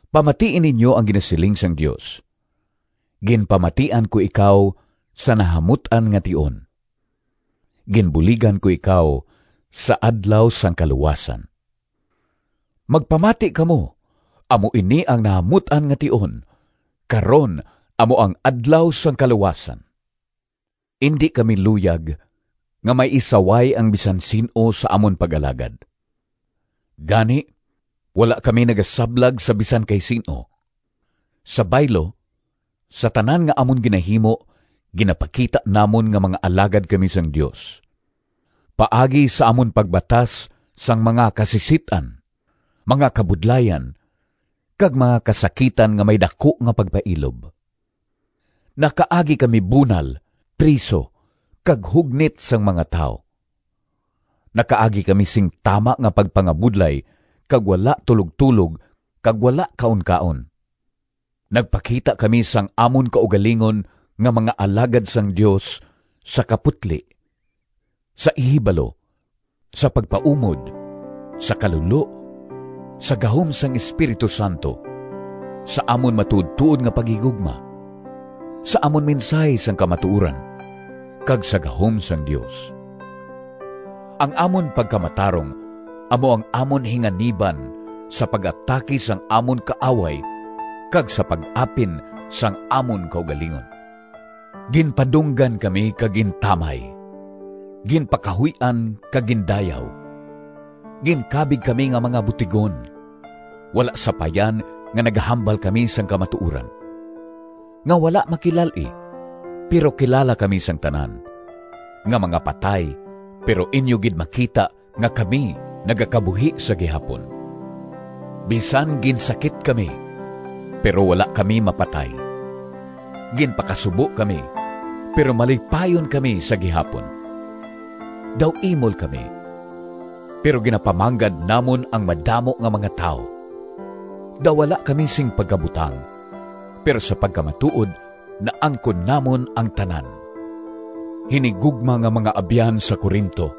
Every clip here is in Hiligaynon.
Pamatii ninyo ang ginasiling sang Dios: “Ginpamatian ko ikaw Sa nahamut-an nga tion, Ginbuligan ko ikaw Sa adlaw sang kaluwasan.” Magpamati kamo! Amo ini ang nahamut-an nga tion, karon amo ang adlaw sang kaluwasan! Indi kami luyag nga may isaway ang bisan sin-o sa amon pag-alagad, gani wala kami nagasablag sa bisan kay sin-o. Sa baylo, sa tanan nga amon ginahimo, ginapakita namon nga mga alagad kami sang Dios, paagi sa amon pagbatas sang mga kasisit-an, mga kabudlayan, kag mga kasakitan nga may daku nga pagpailob. Nakaagi kami bunal, priso, kag hugnit sang mga tawo. Nakaagi kami sing tama nga pagpangabudlay kag wala tulogtulog kag wala kaunkaon. Nagpakita kami sang amon kaugalingon nga mga alagad sang Dios sa kaputli, sa ihibalo, sa pagpaumod, sa kalulo, sa gahom sang Espiritu Santo, sa amon matuodtuod nga paghigugma, sa amon mensahi sang kamatuoran, kag sa gahom sang Dios. Ang amon pagkamatarong amo ang amon hinganiban sa pag-atake sang amon kaaway kag sa pag-apin sang amon kaugalingon. Ginpadunggan kami kag gintamay, ginpakahuy-an kag gindayaw. Ginkabig kami nga mga butigon, wala sapayan nga nagahambal kami sang kamatuoran; nga wala makilal-i, pero kilala kami sang tanan; nga mga patay, pero inyo gid makita nga kami nagakabuhi sa gihapon. Bisan ginsakit kami, pero wala kami mapatay; ginpakasubo kami, pero malipayon kami sa gihapon; daw imol kami, pero ginapamanggad namon ang madamo nga mga tawo; daw wala kami sing pagkabutang, pero sa pagkamatuod naangkon namon ang tanan. Hinigugma nga mga abyan sa Corinto!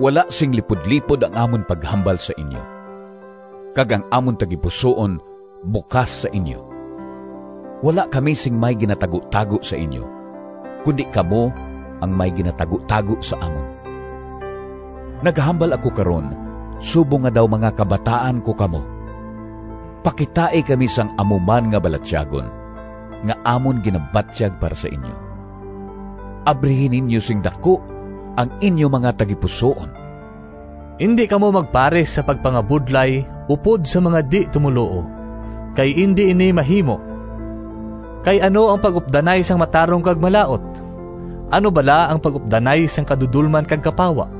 Wala sing lipudlipod ang amon paghambal sa inyo, kag ang amon tagipusoon bukas sa inyo. Wala kami sing may ginatagutago sa inyo, kundi kamo ang may ginatagutago sa amon. Nagahambal ako karon subong nga daw mga kabataan ko kamo. Pakitai kami sang amo man nga balatyagon nga amon ginabatyag para sa inyo. Abrihi ninyo sing daku ang inyo mga tagipusoon! Indi kamo magpares sa pagpangabudlay upod sa mga di-tumoluo, kay indi ini mahimo. Kay ano ang pag-updanay sang matarong kag malaut? Ano bala ang pag-updanay sang kadudolman kag kapawa?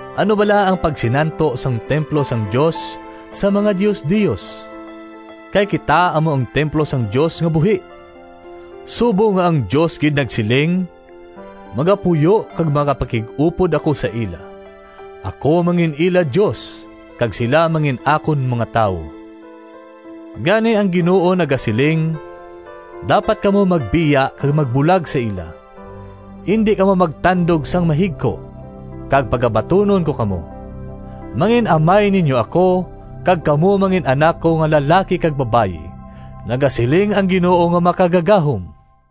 Ano bala ang pagsinanto sang templo sang Dios sa mga diosdios? Kay kita amo ang templo sang Dios nga buhi! Subong nga ang Dios gid nagsiling: “Magapuyo Kag magapakig-upod ako sa ila, Ako mangin-ila Dios, Kag sila mangin-akon mga tawo.” Gani ang Ginoo nagasiling: “Dapat kamo magbiya Kag magbulag sa ila. Indi kamo magtandog sang mahigko, Kag pagabatunon ko kamo. Mangin-amay ninyo ako, Kag kamo Mangin-anak ko nga lalaki kag babayi, Nagasiling ang Ginoo Nga Makagagahom.”